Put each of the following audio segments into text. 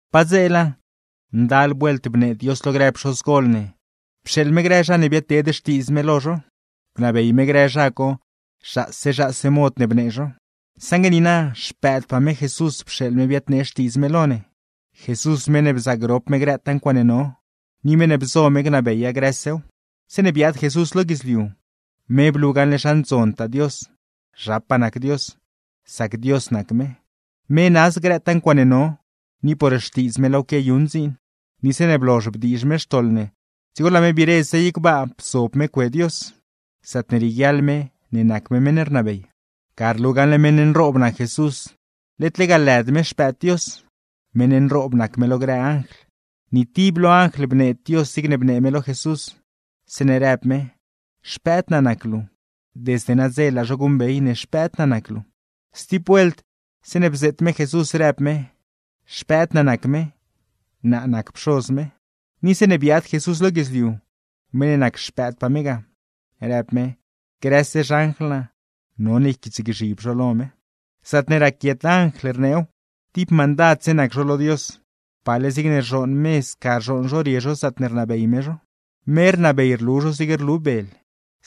Padzeela, ndal vuelt bnee Dios lo grë pxozgoldoo ne, pxeeḻ me grë zha ne biadteed xtiidz me lo zho, bnabey me grë zha co zhaase zhaase mod ne bnee zho. Saṉgue niina, Xpëëdpaa me Jesús pxeeḻ me biadnee xtiidz me lo ne. Jesús meṉ ne bzaagrop me grëtaa ncuaaṉe no, ni meṉ ne bzo me gnabeya grësew. Zeeṉe biaad Jesús lo guidzliu, me blu gaṉle zha ndzontaa Dios, zhapaa nac Dios, sac Dios nac me; me naaz grëtaa ncuaaṉe no, ni por xtiidz me laaw quiayuṉ dziin. Ni zeeṉe blozh bdiizh me xtoḻ ne, dzigo laa me biire zey gbaa bzob me cue Dios, zaatne rieguiaḻ me ne nac me meṉ ne rnabey. Ga rlu gaṉle meṉ nroob nac Jesús, led lega lëd me Xpëëd Dios; meṉ nroob nac me lo grë anjl. Ni tib lo anjl bneed Dios zigne bnee me lo Jesús, zeeṉe rëb me: “Xpëëd naa nac luu. Desde nadze laa zho guṉbey ne Xpëëd naa nac luu.” Stib vuelt zeeṉe bzeet me Jesús, rëb me: “Xpëëd naa nac me, naa nac Pxoz me.” Ni zeeṉe biaad Jesús lo guidzliu; meṉ ne nac Xpëëdpaa me ga, rëb me: “Grëse xanjl naa, none yquiitsgzhib zho lo me.” Zaatne raquiet anjl, rneew: Tib mandadse nac zho lo Dios, pale zigne rzhooṉ me sca rzhooṉ zho rie zho zaatne rnabey me zho; me rnabey rlu zho zigne rlu bel.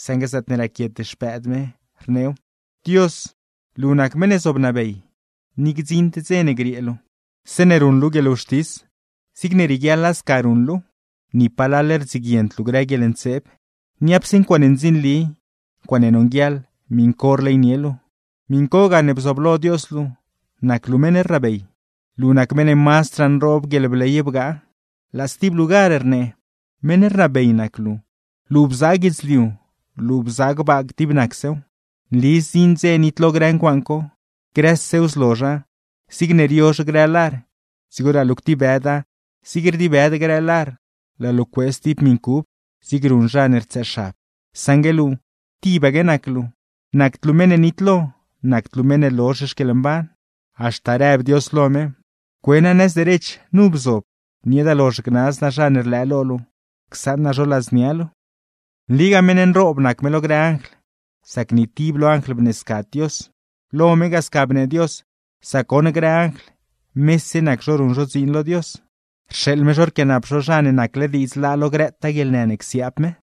Saṉgue zaatne raquiet Xpëëd me, rneew: Dios, luu nac meṉ ne zobnabey, ni gdziṉd dze ne griee luu; zeeṉe ruṉ luu guieḻwxtis, zigne rieguiaḻa sca ruṉ luuw. Ni palal rdziguiend luu grë guieḻntseeb, niapse ncuaaṉe ndzinli, ncuaaṉe nonguieḻ, miṉ co rleynie luu; miṉ co gane bzooblo Dios luu, nac luu meṉ ne rnabey, luu nac meṉ ne mazdraa nroob guieḻbley bgaa. Laa stib lugar rnee: Meṉ rnabey nac luu, luu bzaa guidzliu, luu bzaa gbaa dib nacsew. Nli zdziṉ dze nitlo grë ncuaaṉ co, grësew zlozha zigne riozh grë lar, dzigo laa luu ctibëda, zig rdibëd grë lar, laa luu cuee stib miṉ cub; zigne ruṉ zha ne rtsëëxab. Saṉgue luu, tibaque nac luu, nacd luu meṉ ne nitlo, nacd luu meṉ ne lozh xquieḻmban. Haxta rëb Dios lo me: Cue naa nëz derech, nu bzob, nieeda lozh gnaz naa zha ne rlëë lo luu, csaṉ naa zho ladznia luu. Nligaa meṉ nroob nac me lo grë anjl, sac ni tib lo anjl bneescad Dios. Lo me ga sca bnee Dios, sac goṉ grë anjl, mese nac zho ruṉ zho dziin lo Dios, rxeeḻ me zho rquianap zho zha ne nacle diidz laa lo grëtaa guieḻnë ne csiaab me.